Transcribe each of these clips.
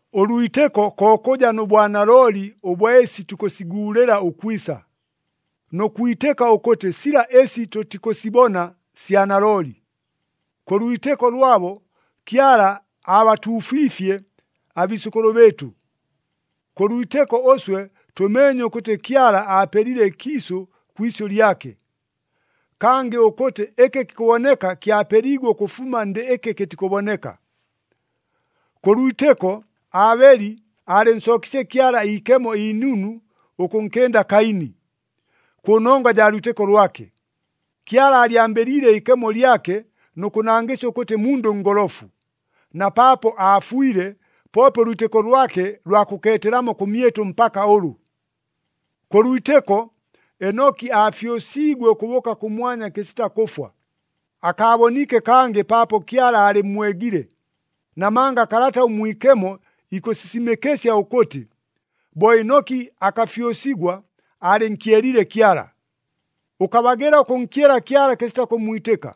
Ʉlwitɨko ko kʉja nʉ bwanalooli ʉbwa ɨsi tukʉsiguulɨla ʉkwisa, nʉ kwitɨka ʉkʉtɨ sila ɨsi tʉtikʉsibona sya nalooli. Kʉ lwitɨko lwabo, Kyala aabatuufiifye abiisʉkʉlʉ bɨɨtʉ. Kʉ lwitɨko ʉswe tʉmeenye ʉkʉtɨ Kyala aapelile ɨkiisʉ kwi isyʉ lyake, kangɨ ʉkʉtɨ ɨkɨ kikʉboneka kyapeliigwe ʉkʉfuma ndɨ ɨkɨ kɨtikʉboneka. Kʉ lwitɨko, Aabeli aalɨnsookiisye Kyala iikemo inunu ʉkʉnkɨnda Kaini. Kʉ nongwa jaa lwitɨko lwake, Kyala aalyambɨliile iikemo lyake nʉ kʉnangɨsya ʉkʉtɨ mundʉ ngolofu. Na paapo aafwile, poope ʉlwitɨko lwake lwa kʉkeetelamo kʉmyɨtʉ mpaka ʉlʉ. Kʉ lwitɨko, Enoki aafyʉsiigwe ʉkʉbʉʉka kʉmwanya kɨsita kʉfwa, akaaboniike kangɨ paapo Kyala aalɨmmwegile. Namanga Kalata ʉMwikemo ikʉsisimɨkɨsya ʉkʉtɨ, bo Enoki akafyʉsigwa, aalɨnkyeliile Kyala. Ʉkabagɨla ʉkʉnkyela Kyala kɨsita kʉmmwitɨka.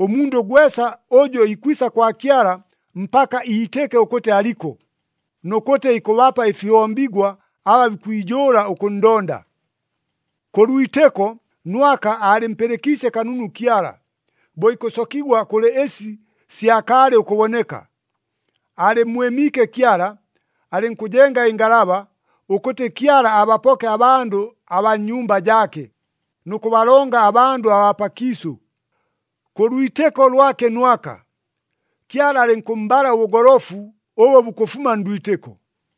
Ʉmundʉ gwesa ʉjʉ ikwisa kwa Kyala mpaka iitɨke ʉkʉtɨ aliko, nʉ kʉtɨ ikʉbapa ɨfihombigwa aba bikwijʉʉla ʉkʉnndonda. Kʉ lwitɨko, Nwaka aalɨmpɨlɨkiisye kanunu Kyala, bo ikʉsokigwa kʉlɨ ɨsi syakaalɨ ʉkʉboneka. Aalɨmmwɨmiike Kyala, alɨnkʉjenga ɨngalaba, ʉkʉtɨ Kyala abapoke abandʉ abaa nnyumba jaake, nʉ kʉbalonga abandʉ abaa pakiisʉ. Kʉ lwitɨko lwake Nwaka, Kyala alɨnkʉmmbala ʉbʉgolofu ʉbʉ bukʉfuma ndwitɨko.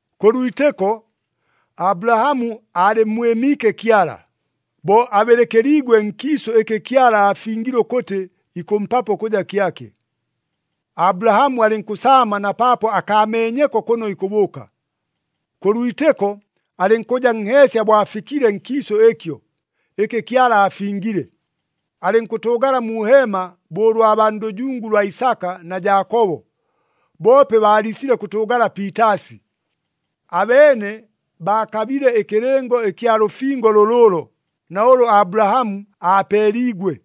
Kʉ lwitɨko, Abulahamu aalɨmmwɨmiike Kyala, bo abɨlɨkɨliigwe nkiisʉ ɨkɨ Kyala aafingile ʉkʉtɨ ikʉmpapo ʉkʉja kyake. Abulahamu alɨnkʉsaama na paapo akaameenyeko kʉno ikʉbʉʉka. Kʉ lwitɨko, alɨnkʉja nheesya bo afikile nkiisʉ ɨkyo, ɨkɨ Kyala aafingile. Alɨnkʉtʉʉgala mu heema bo ʉlwa baa ndʉjungu lwa Isaka na Jaakobo, boope baaliisile kʉtʉʉgala piitaasi. Abeene baakabile ɨkɨlɨngo ɨkya lʉfingo lʉlʉʉlo na ʉlʉ Abulahamu aapeeliigwe.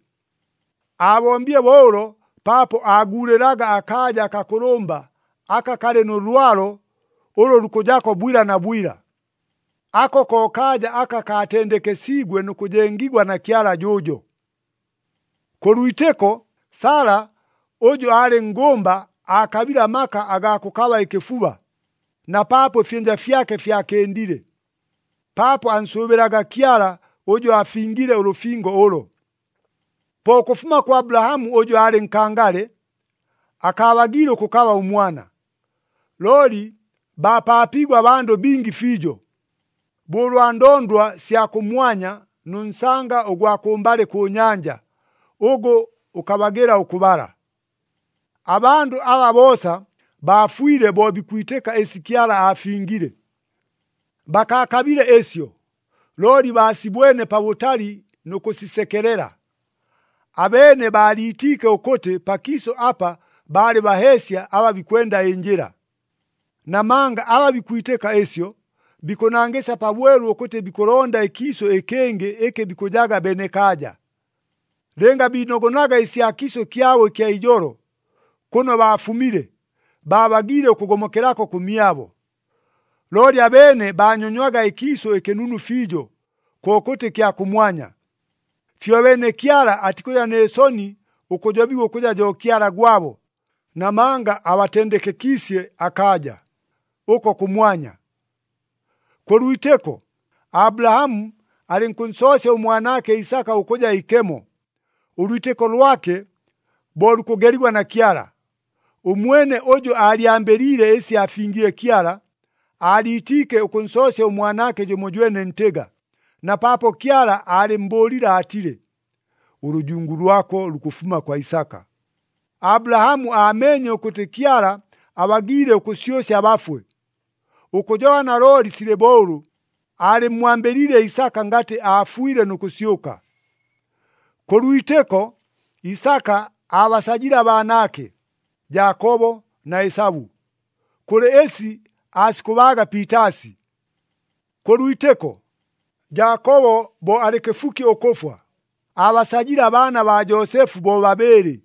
Aabombile bo ʉlo paapo aaguulɨlaga akaaja akakʉlʉmba aka kalɨ nʉ lwalo ʉlʉ lukʉjako bwila na bwila. Ako ko kaaja aka kaatendekesiigwe nʉ kʉjengigwa na Kyala jʉʉjo. Kʉ lwitɨko, Sala ʉjʉ aalɨ nngʉmba aakabile amaka agaa kʉkaba ɨkɨfuba, na paapo ɨfyɨnja fyake fyakɨndile. Paapo ansʉʉbɨlaga Kyala ʉjʉ aafingile ʉlʉfingo ʉlo. Po ʉkʉfuma kwa Abulahamu ʉjʉ aalɨ nkangale, akaabagiile ʉkʉkaba ʉmwana, looli baapaapiigwe abandʉ bingi fiijo, bo ʉlwa ndondwa sya kʉmwanya nʉ nsanga ʉgwa kʉmbalɨ kʉ nyanja, ʉgʉ ʉkabagɨla ʉkʉbala. Abandʉ aba boosa baafwile bo bikwitɨka ɨsi Kyala aafingile. Bakaakabile ɨsyo, looli baasibwene pabʉtali nʉ kʉsisekelela. Abeene baaliitiike ʉkʉtɨ pakiisʉ apa baalɨ baheesya aba bikwenda ɨnjɨla. Namanga aba bikwitɨka ɨsyo, bikʉnangɨsya pabwelu ʉkʉtɨ bikʉlonda ɨkiisʉ ɨkɨngɨ ɨkɨ bikʉjaga benekaaja. Lɨnga biinogonaga ɨsya kiisʉ kyabo ɨkya ijolo, kʉno baafumile, baabagiile ʉkʉgomokelako kʉmyabo. Looli abeene baanyonywaga ɨkiisʉ ɨkɨnunu fiijo, kokʉtɨ ɨkya kʉmwanya. Fyobeene Kyala atikʉja nɨ soni ʉkʉjobigwa ʉkʉja jo Kyala gwabo, namanga abatendekekiisye akaaja, ʉko kʉmwanya. Kʉ lwitɨko, Abulahamu alɨnkʉnsoosya ʉmwanaake Isaka ʉkʉja ikemo, ʉlwitɨko lwake bo lukʉgeligwa na Kyala. Ʉmwene ʉjʉ aalyambɨliile ɨsi aafingile Kyala, aaliitiike ʉkʉnsoosya ʉmwanaake jʉmojwene ntɨga, na paapo Kyala aalɨmmbʉʉlile aatile, “Ʉlʉjungu lwako lukʉfuma kwa Isaka.” Abulahamu aameenye ʉkʉtɨ Kyala abagiile ʉkʉsyʉsya abafwe. Ʉkʉjoba nalooli silɨ bo ʉlʉ aalɨmmwambɨliile Isaka ngatɨ aafwile nʉ kʉsyʉka. Kʉ lwitɨko, Isaka aabasajile abaanaake, Jaakobo na Esabu, kʉlɨ ɨsi aasikʉbaaga piitaasi. Kʉ lwitɨko, Jaakobo bo alɨ kɨfuki ʉkʉfwa, aabasajile abaana baa Joosefu bobabɨɨlɨ,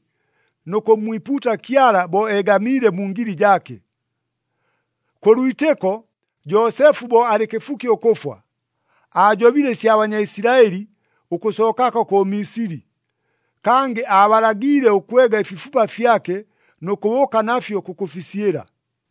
nʉ kʉmmwipuuta Kyala bo eegamiile mu ngili jaake. Kʉ lwitɨko, Joosefu bo alɨ kɨfuki ʉkʉfwa, aajobile ɨsya Banyaisilaɨli ʉkʉsookako kʉ Misili. Kangɨ aabalagiile ʉkwega ɨfifupa fyake nʉ kʉbʉʉka nafyo kʉkʉfisyɨla.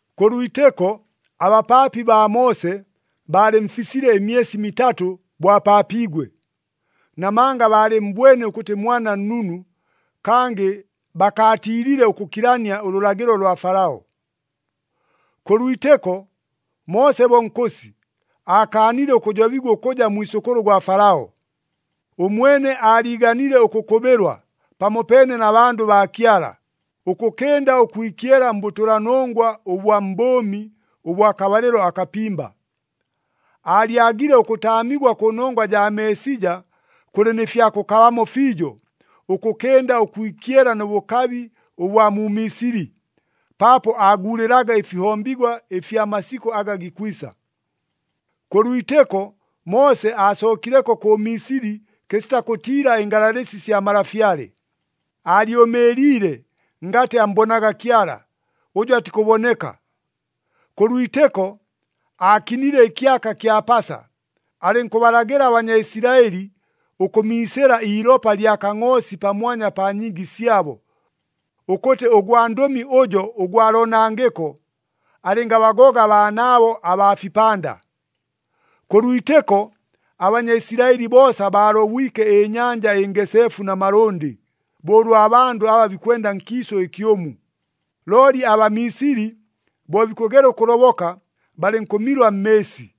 Kʉ lwitɨko, abapaapi baa Moose baalɨmfisile ɨmyesi mitatʉ bo apaapiigwe. Namanga baalɨmmbwene ʉkʉtɨ mwana nnunu, kangɨ bakaatiilile ʉkʉkilania ʉlʉlagɨlo lwa Falao. Kʉ lwitɨko, Moose bo nkʉsi, aakaanile ʉkʉjobigwa ʉkʉja mwisʉkʉlʉ gwa Falao. Ʉmwene aaliiganile ʉkʉkʉbɨlwa pamopeene na bandʉ baa Kyala, ʉkʉkɨnda ʉkwikyela mbʉtʉlanongwa ʉbwa mbʉʉmi ʉbwa kabalɨlo akapimba. Aalyagile ʉkʉtaamigwa kʉnongwa jaa Meesija kʉlɨ nɨ fya kʉkabamo fiijo, ʉkʉkɨnda ʉkwikyela nʉ bʉkabi ʉbwa mu Misili, paapo aaguulɨlaga ɨfihombigwa ɨfya masikʉ aga gikwisa. Kʉ lwitɨko, Moose aasookileko kʉ Misili kɨsita kʉtiila ɨngalalɨsi sya malafyale. Aalyʉmɨɨliile ngatɨ ammbonaga Kyala, ʉjʉ atikʉboneka. Kʉ lwitɨko, aakinile ɨkyaka kya Pasa, alɨnkʉbalagɨla aBanyaisilaɨli ʉkʉmiisɨla iilopa lya kangʼoosi pamwanya pa nyiigi syabo, ʉkʉtɨ ʉgwandʉmi ʉjo ʉgwa loonangɨko alɨngabagoga abaanaabo abaa fipanda. Kʉ lwitɨko, aBanyaisilaɨli boosa baalobwike ɨNyanja ɨNgeseefu na malʉndɨ, bo ʉlwa bandʉ aba bikwenda nkiisʉ ɨkyʉmu. Looli aBamisili bo bikʉgela ʉkʉloboka, balɨnkʉmilwa mmɨɨsi.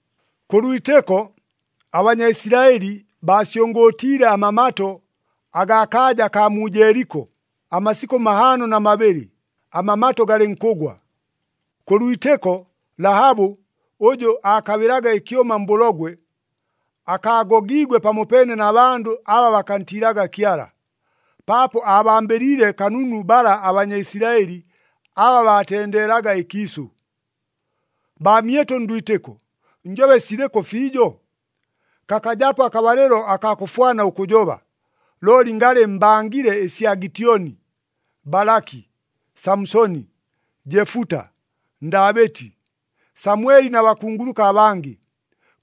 Kʉ lwitɨko, aBanyaisilaɨli baasyʉngʉʉtiile amamato agaa kaaja akaa mu Jeeliko amasikʉ mahaano na mabɨlɨ, amamato galɨnkʉgwa. Kʉ lwitɨko, Lahabu ʉjʉ aakabɨlaga ɨkyʉma mbʉlogwe, akaagogiigwe pamopeene na bandʉ aba bakantiilaga Kyala. Paapo aabambɨliile kanunu bala aBanyaisilaɨli aba baatendeelaga ɨkiisʉ. Baamyɨtʉ ndwitɨko, njobe silɨkʉ fiijo? Kakajapo akabalɨlo akaa kʉfwana ʉkʉjoba, looli ngalɨ mbangile ɨsya Gityoni, Balaki, Samusoni, Jefuta, Ndaabɨti, Samweli na bakunguluka abangɨ.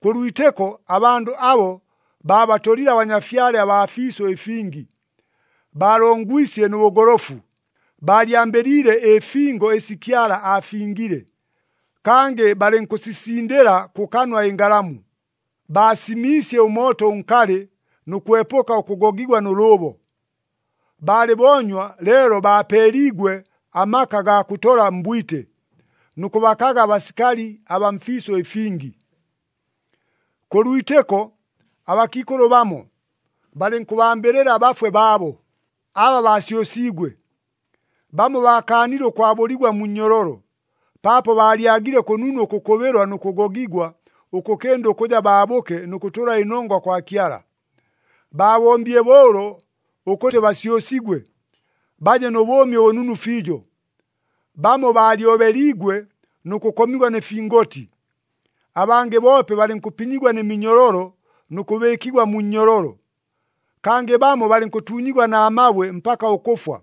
Kʉ lwitɨko, abandʉ abo baabatolile abanyafyale abaa fiisʉ ɨfingi. Baalongwisye nʉ bʉgolofu, baalyambɨliile ɨfingo ɨsi Kyala aafingile. Kangɨ balɨnkʉsisindɨla kʉkanwa ɨngalamu, baasimiisye ʉmooto ʉnkalɨ, nʉ kwepʉka ʉkʉgogigwa nʉ lʉʉbo. Baalɨ boonywa leelo baapeeliigwe amaka agaa kʉtola mbwite, nʉ kʉbakaga abasikali abaa mfiisʉ ɨfingi. Kʉ lwitɨko abakiikʉlʉ bamo, balɨnkʉbambɨlɨla abafwe baabo, aba baasyʉsiigwe. Bamo baakaanile ʉkwabʉligwa mu nnyololo, paapo baalyagile kʉnunu ʉkʉkʉbɨlwa nʉ kʉgogigwa, ʉkʉkɨnda ʉkʉja baabʉke nʉ kʉtʉla ɨnongwa kwa Kyala. Baabombile bo ʉlo ʉkʉtɨ basyʉsigwe, baje nʉ bʉʉmi ʉbʉnunu fiijo. Bamo baalyobeliigwe nʉ kʉkomigwa nɨ fingoti. Abangɨ boope balɨnkʉpinyigwa nɨ minyololo nʉ kʉbɨɨkigwa mu nnyololo. Kangɨ bamo balɨnkʉtuunyigwa na mabwe mpaka ʉkʉfwa,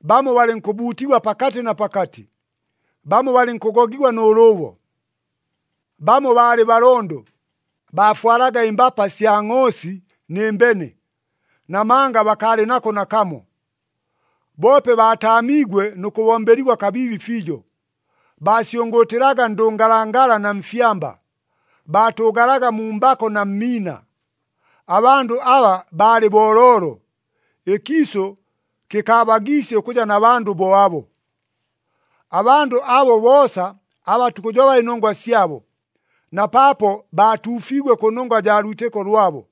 bamo balɨnkʉbuutigwa pakatɨ na pakatɨ, bamo balɨnkʉgogigwa nʉ lʉʉbo. Bamo baalɨ balondo, baafwalaga ɨmbapa sya ngʼoosi nɨ mbene, namanga bakaalɨ nako nakamo. Boope baataamiigwe nʉ kʉbombeligwa kabiibi fiijo. Baasyʉngʉʉtɨlaga ndʉngalangala na mfyamba, baatʉʉgalaga mu mbako na mmiina. Abandʉ aba baalɨ booloolo, ɨkiisʉ kɨkaabagiisye ʉkʉja na bandʉ bo abo. Abandʉ abo boosa aba tukʉjoba ɨnongwa syabo, na paapo baatuufiigwe kʉnongwa jaa lwitɨko lwabo,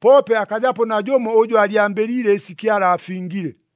poope akajapo najʉmo ʉjʉ aalyambɨliile ɨsi Kyala aafingile.